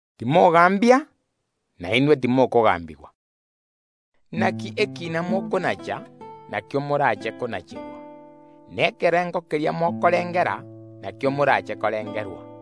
“Timogaambia, nainwe timokogaambigwa. Inaki ekiina mokonacha, nakio morache konacherwa. Na ekerengo keria mokorengera, nakio morache korengerwa.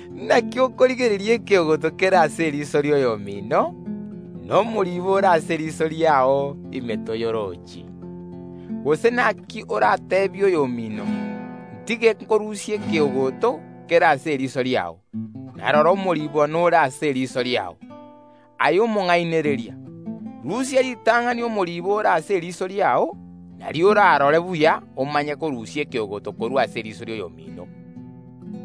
Inaki okorigereria ekeogoto kere ase eriiso ri’oyomino, na omoriibo ore ase eriiso riao ime toyorochi? Gose ’naki orateebie oyomino: ’Ntige ’nkorusie ekeogoto kere ase eriiso riao, na rora omoriibo nore ase eriiso riao? Aye omonga’inereria, rusia ritang’ani omoriibo ore ase eriiso riao, nario orarore buya omanye korusia ekeogoto korwa ase eriiso ri’oyomino.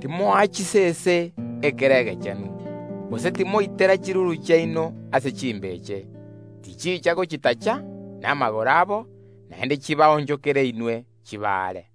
“Timoa chisese ekere egechenu, gose timoitera chiruru chiaino ase chimbeche, tichicha gochitacha namagoro abo, naende chibaonchokere inwe, chibarie.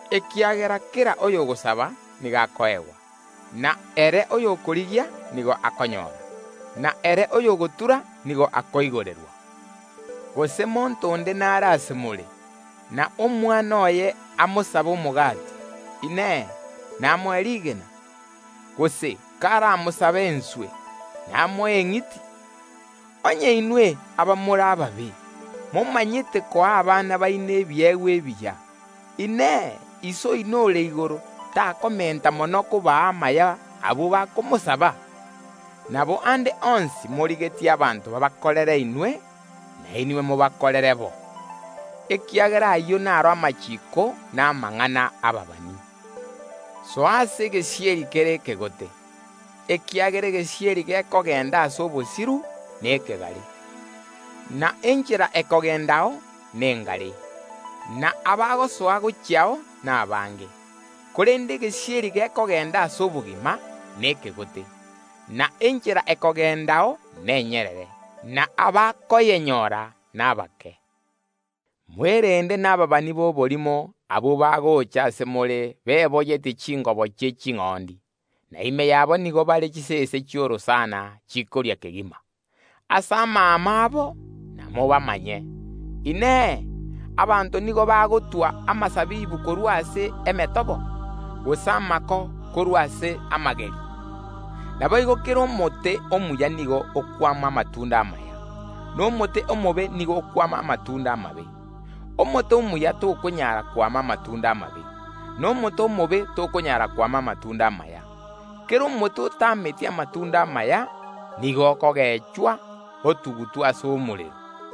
Ekiagera kera oyogosaba nigo akoegwa, na ere oyokorigia nigo akonyora, na ere oyogotura nigo akoigorerwa. Gose monto onde n’are ase more, na omwana oye amosabe omogati, Inee, namoe rigena? Gose karamosabe enswe, namoe eng’iti? Onye inwe, abamore ababe, momanyete koa abana baino ebiegwa ebiya, Inee, Iso oino ore igoro takomenta mono kobaa amaya abwo bakomosaba? “Nabo ande onsi morigetie abanto babakorere inwe, nainwe mobakorere boigo. Ekiagera ayio naro amachiiko na amang’ana y’ababani. “Soa ase egesieri kere ekegote, ekiagera egesieri gekogenda ase obosiru nekegare, na enchera ekogendao nengare, na abagosoa gochiao nabange. Korende egesieri gekogenda ase obogima nekegote, na enchera ekogendao nenyerere, na abakoyenyora nabake. “Mwerende nababani b’oborimo abwo bagocha ase more beboyetie chingobo chi’eching’ondi, na ime yabo nigo bare chisese chi’orosana chintindi mono. Ase amaamo abo ’namobamanye. Inee! Abanto nigo bagotwa amasabibu korwa ase emetobo, gose amako korwa ase amageri? Naboigo kera omote omuya nigo okwama amatunda amaya, na omote omobe nigo okwama amatunda amabe. Omote omuya tokonyara kwama amatunda amabe, na omote omobe tokonyara kwama amatunda amaya. Kera omote otameti amatunda amaya nigo okogechwa, otugutwa ase omorero.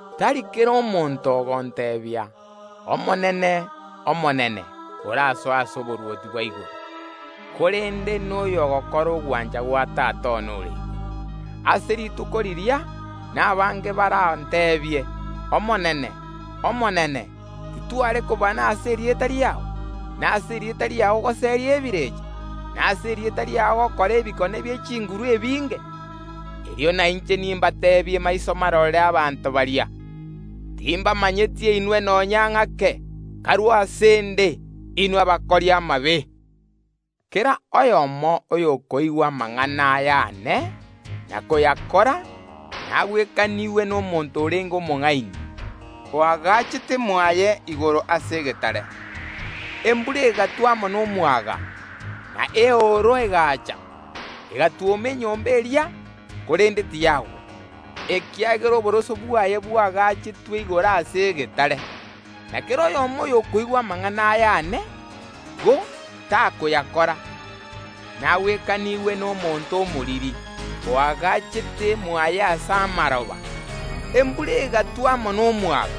“Tari kera omonto ogonteebia: Omonene Nyasae, orasoe ase oborwoti bwa igoro, korende n’oyogokora ogwancha gwa Tata one ore igoro. Ase rituko riria nabange baranteebie: Omonene Nyasae, titware kobana ase erieta riao, na ase erieta riao goseria ebirecha, na ase erieta riao togakora ebikone ebinge bie chinguru? Erio nainche nimbateebie maiso marore abanto baria: Timbamanyeti inwe nonya ng’ake; karue ase ’nde, inwe abakori amabe! “Kera oyomo oyokoigwa amang’ana aya aane, na koyakora, nagwekanigwe n’omonto orenge omong’aini, oagachete mwaye igoro ase egetare; embura egatwa amo nomwaga, na eooro egaacha, egatwoma enyomba eria, korende tiyagwa, ekiagera oboroso bwaye bwaagachetwe igoro ase egetare. Na kera oyomo oyokoigwa amang’ana aya aane, ko tayakora, nagwekanigwe n’omonto omoriri, oagachete mwaye ase amaroba; embura egatwa amo nomwaga,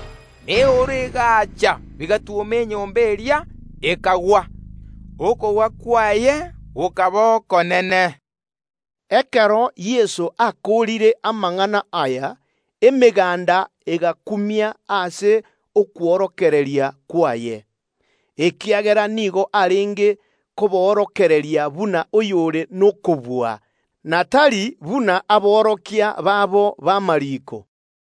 na eooro egaacha, bigatwoma enyomba eria, ekagwa; okogwa kwaye gokaba okonene.” Ekero Yeso akoorire amang’ana aya, emeganda egakumia ase okworokereria kwaye, ekiagera nigo arenge koborokereria buna oyore nokobua, na tari buna aborokia babo b’amariiko.